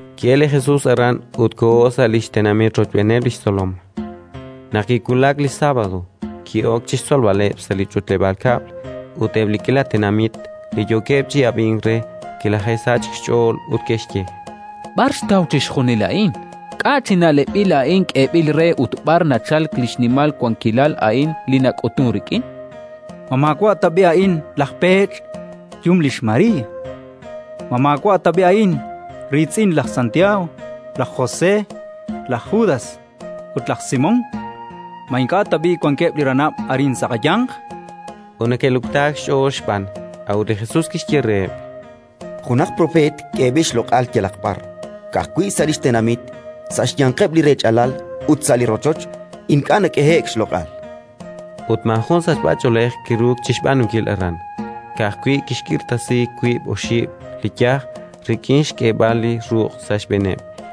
Ki'elk li Jesus aran ut koho sa' li xtenamit rochb'eeneb' li xtzolom. Naq kiwulak li sábado, ki'ok chi xtzolb'aleb' sa' li ch'utleb'aal kab'l; ut eb' li k'iila tenamit li yookeb' chi ab'ink re, kilaje'sachk xch'ool ut ke'xye: —B'ar xtaw chixjunil a'in? K'a' chi na'leb'il a'in k'eeb'il re ut b'ar nachalk li xnimal wankilal a'in li nak'utunk rik'in? Ma maawa' tab'i' a'in laj peech', xyum lix María? Ma maawa' tab'i' a'in riitz'in laj Santiago, laj José, laj Judas ut laj Simón? Ma ink'a' tab'i' wankeb' li ranab' arin sa' qayanq? Ut neke'luktaak xch'ool xb'aan. A'ut li Jesus kixye reheb': —Junaq propeet k'eeb'il xloq'al yalaq b'ar. Ka'ajwi' sa' li xtenamit, sa' xyanqeb' li rech'alal ut sa' li rochoch, ink'a' nak'ehe'k xloq'al. Ut maajun sachb'ach'oolej kiruuk chi xb'aanunkil aran; ka'ajwi' kixk'irtasi wiib' oxib' li yaj rik'in xk'eeb'al li ruq' sa' xb'eeneb'.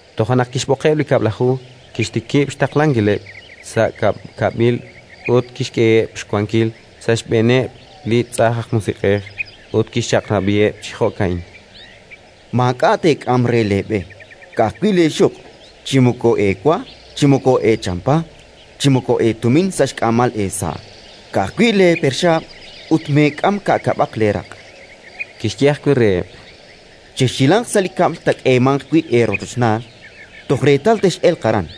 Toja' naq kixb'oqeb' li Kab'laju, kixtikib' xtaqlankileb' sa' ka'kab'il ut kixk'eheb' xwankil sa' xb'eeneb' li tz'ajn aj musiq'ej. Ut kixchaq'rab'iheb' chi jo'ka'in: —Maak'a' teek'am re leeb'e, ka'ajwi' leexuq'; chi moko eewa, chi moko eechampa, chi moko eetumin sa' xk'aamal eesa'; ka'ajwi' leeperxaab'. Ut meek'am ka'kab'aq leeraq'. Kixye ajwi' reheb': —Chexhilanq sa' li kab'l taak'eemanq wi' eerochochnaal, toj reetal tex'elq aran;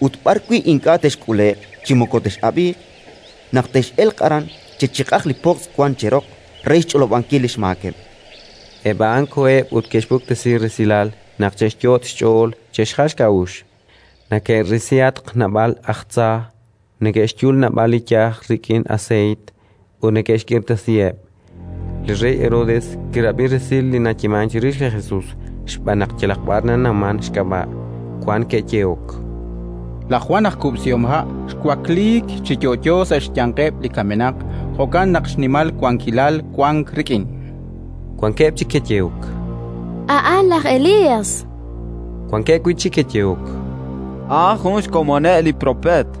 ut b'arwi' ink'a' texk'ule'q chi moko tex'ab'iiq, naq tex'elq aran, chechiq'aq li pojtz' wank cheroq re xch'olob'ankil li xmaakeb'. Eb' a'an koheb' ut ke'xpuktesi resil naq che'xyot' xch'ool che'xjal xk'a'uxl: neke'risihatq naab'aleb' aj tza, neke'xyul naab'al li yaj rik'in aseeyt, ut neke'xk'irtasiheb'. Li rey Herodes kirab'i resil li nayeemank chirix li Jesus xb'aan naq yalaq b'ar nanawmank xk'ab'a'. Wan ke'yehok: “Laj Jwan aj kub'sihomha' xwakliik chi yo'yo sa' xyanqeb' li kamenaq, jo'kan naq xnimal wankilal wank rik'in”. Wankeb' chik ke'yehok: “A'an laj Elías”. Wankeb' wi' chik ke'yehok: “A'an jun xkomoneb' li propeet”.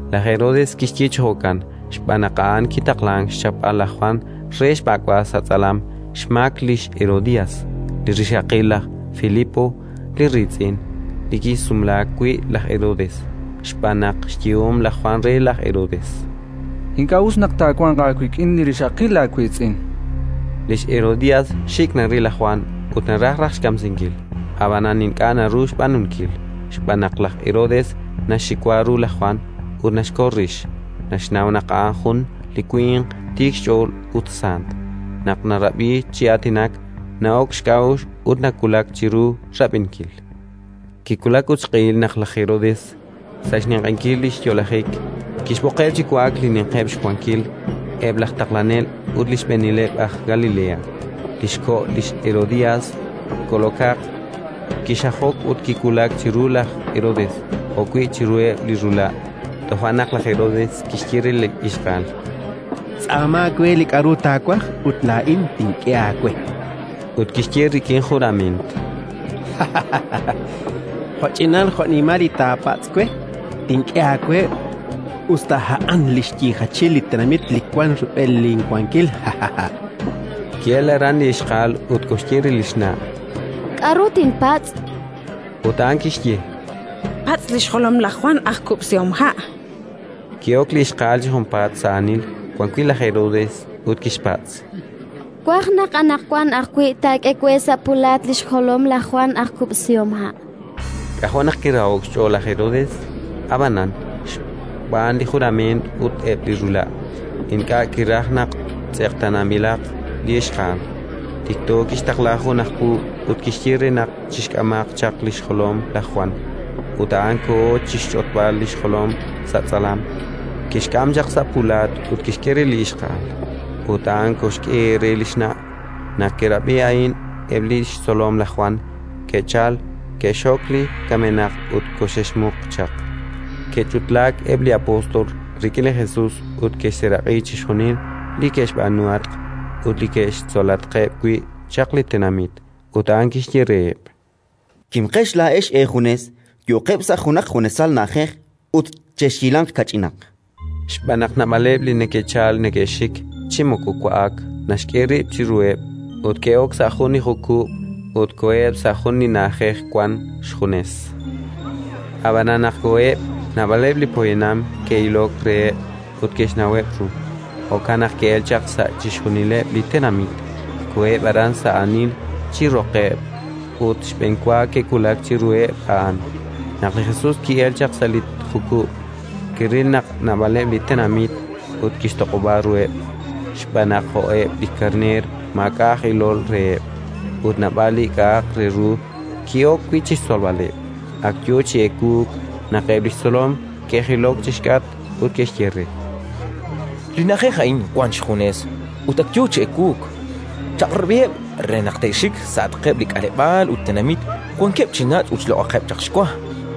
Laj Herodes kixye chi jo'kan xb'aan naq a'an kitaqlank xchapb'al laj Jwan re xb'ak'b'al sa' tz'alam xmaak lix Herodías, li rixaqil laj Filipo li riitz'in, li kisumlaak wi' laj Herodes. Xb'aan naq xyehom laj Jwan re laj Herodes: “Ink'a' us naq taawanq aawik'in li rixaqil laawiitz'in”. Lix Herodías xik' naril laj Jwan ut naraj raj xkamsinkil, ab'anan ink'a' naru xb'aanunkil, xb'aan naq laj Herodes naxxiwa ru laj Jwan ut naxkol rix: naxnaw naq a'an jun li winq tiik xch'ool ut sant; naq narab'i chi aatinak, na'ok xk'a'uxl ut nawulak chiru rab'inkil. Kiwulak ut xq'ehil naq laj Herodes, sa' xninq'ehinkil li xyo'lajik, kixb'oqeb' chi wa'ak li ninqeb' xwankil, eb' laj taqlanel ut li xb'eenileb' aj Galilea. Li xko' lix Herodías kol'okaq, kixajok ut kiwulak chiru laj Herodes jo'wi' chiruheb' li rula'. Toja' naq laj Herodes kixye re li ixqa'al: —Tz'aama we li k'aru taawaj ut laa'in tink'e aawe. Ut kixye rik'in jurament: —Jo'ch'inal jo'nimal li taapatz' we, tink'e aawe, us ta a'an li xyiijachil li tenamit li wank rub'el linwankil. Ki'elk aran li ixqa'al ut koxye re li xna': —K'aru tinpatz'? Ut a'an kixye: —Patz' li xjolom laj Jwan aj kub'sihomha'. Ki'ok li ixqa'al chi junpaat, sa' aanil, wan wi' laj Herodes, ut kixpatz': —Twaj naq anaqwan ajwi' taak'e we sa' pulaat li xjolom laj Jwan aj kub'sihomha'. K'ajo' naq kiraho'k xch'ool laj Herodes, ab'anan, xb'aan li jurament ut eb' li rula', ink'a' kiraj naq tz'eqtaananb'ilaq li ixqa'al. Tikto kixtaqla jun aj puub' ut kixye re naq chixk'amaq chaq li xjolom laj Jwan. Ut a'an koho chi xch'otb'al li xjolom sa' tz'alam, kixk'am chaq sa' pulaat ut kixk'e re li ixqa'al, ut a'an koxk'e re li xna'. Naq ke'rab'i a'in eb' li xtzolom laj Jwan, ke'chalk, ke'xxok li kamenaq ut koxe'xmuq chaq. Ke'ch'utlaak eb' li apóstol rik'in li Jesus ut ke'xseeraq'i chixjunil li ke'xb'aanuhatq ut li ke'xtzolatqeb' wi' chaq li tenamit. Ut a'an kixye reheb': —Kimqex laa'ex eejunes, yo'qeb' sa' junaq junesal na'ajej ut chexhilanq kach'inaq. Xb'aan naq naab'aleb' li neke'chalk neke'xik: chi moko wa'ak naxk'e rib' chiruheb'. Ut ke'ok sa' jun li jukub' ut koheb' sa' jun li na'ajej wank xjunes. Ab'anan, naq koheb', naab'aleb' li poyanam ke'ilok reheb' ut ke'xnaweb' ru: jo'kan naq ke'elk chaq sa' chixjunileb' li tenamit, koheb' aran sa' aanil chi roqeb' ut xb'enwa ke'wulak chiruheb' a'an. Naq li Jesus ki'elk chaq sa' li jukub', kiril naq naab'aleb' li tenamit ut kixtoq'ob'a ruheb', xb'aan naq jo'keb' li karneer maak'a' aj ilol reheb'; ut naab'al li k'a'aq re ru ki'ok wi' chi xtzolb'aleb'. Ak yo chi ewuuk naq eb' li xtzolom ke'jilok chi xk'atq ut ke'xye re: —Li na'ajej a'in wank xjunes ut ak yo chi ewuuk. Chaq'rab'iheb' re naq te'xik sa'atqeb' li k'aleb'aal ut tenamit wankeb' chi nach' ut xloq'aqeb' chaq xwa.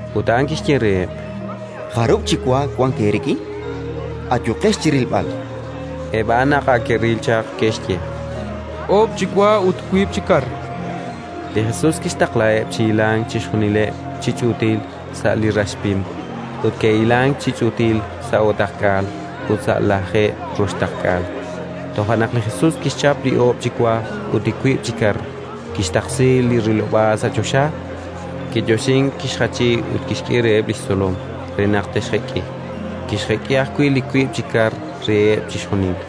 Ut a'an kixye reheb': —Jarub' chi wa wank eerik'in? Ayuqex chi rilb'al. Eb' a'an, naq ak ke'ril chaq, ke'xye: —Oob' chi wa ut wiib' chi kar. Li Jesus kixtaqlaheb' chi hilank chixjunileb' chi ch'uutil sa' li rax pim. Ut ke'hilank chi ch'uutil sa' o'taqk'aal ut sa' lajeeb' roxtaqk'aal. Toja' naq li Jesus kixchap li oob' chi wa ut li wiib' chi kar, kixtaqsi li rilob'aal sa' choxa, kiyoxink, kixjachi ut kixk'e reheb' li xtzolom re naq te'xjek'i. Kixjek'i ajwi' li wiib' chi kar reheb' chixjunil.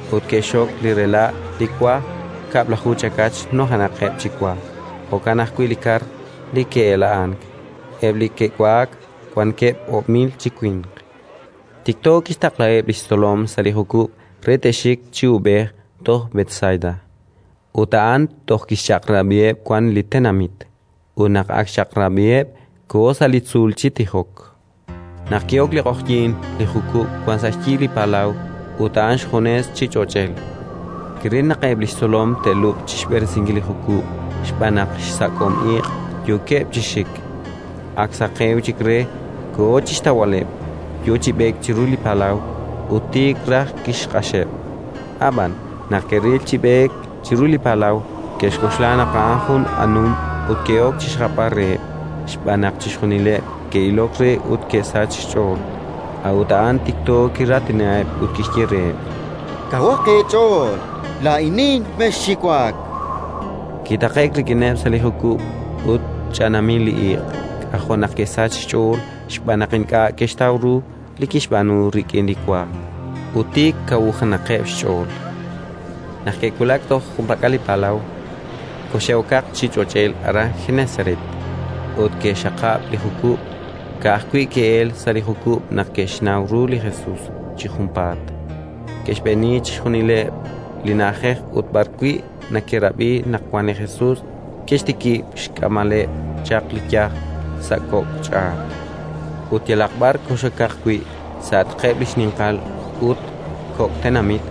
Ut ke'xxok li rela' li wa, kab'laju chakach nujenaqeb' chi wa; jo'kan ajwi' li kar li ke'ela'ank. Eb' li ke'wa'ak wankeb' oob' mil chi winq. Tikto kixtaqlaheb' li xtzolom sa' li jukub' re te'xik chi uub'ej toj Betsaida, ut a'an toj tixchaq'rab'iheb' wan li tenamit. Ut naq ak xchaq'rab'iheb', koho sa' li tzuul chi tijok. Naq ki'ok li q'oqyink, li jukub' wank sa' xyi li palaw ut a'an xjunes chi ch'och'el. Kiril naq eb' li xtzolom te'lub'q chi xb'eresinkil li jukub' xb'aan naq sa' xsak'om iq' yookeb' chi xik. Ak saqewk chik re, koho chi xtawb'aleb', yo chi b'eek chiru li palaw, ut tiik raj kixq'axeb'. Ab'an, naq ke'ril chi b'eek chiru li palaw, ke'xk'oxla naq a'an jun anum ut ke'ok chi xjapb'al reheb', xb'aan naq chixjunileb' ke'ilok re ut ke'sachk xch'ool. A'ut a'an tikto kiraatinaheb' ut kixye reheb': —Kawaq eech'ool: laa'inin. Mexxiwak! Kitaqe'k rik'ineb' sa' li jukub', ut ch'anaamil li iq': k'ajo' naq ke'sachk xch'ool, xb'aan naq ink'a' ke'xtaw ru li kixb'aanu rik'in li wa, ut tik kawujenaqeb' xch'ool. Naq ke'wulak toj junpak'al li palaw, koxe'okaq chi ch'och'el aran Genesaret, ut ke'xxaqab' li jukub'. Ka'ajwi' ke'elk sa' li jukub' naq ke'xnaw ru li Jesus chi junpaat. Ke'xb'eeni chixjunileb' li na'ajej ut b'ar wi' neke'rab'i naq wank li Jesus ke'xtikib' xk'amb'aleb' chaq li yaj sa' kok' ch'aat. Ut yalaq b'ar kox'okaq wi', sa'atqeb' li xninqal ut kok' tenamit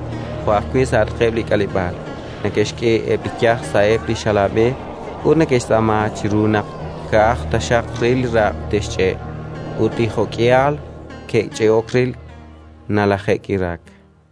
jo' ajwi' sa'atqeb' li k'aleb'aal, neke'xk'e eb' li yaj sa'eb' li xalaab'e ut neke'xtz'aama chiru naq ka'aj taxaq re li raq' te'xch'e'. Ut li jo'k'ihal ke'ch'e'ok re, nalaje'k'iraak.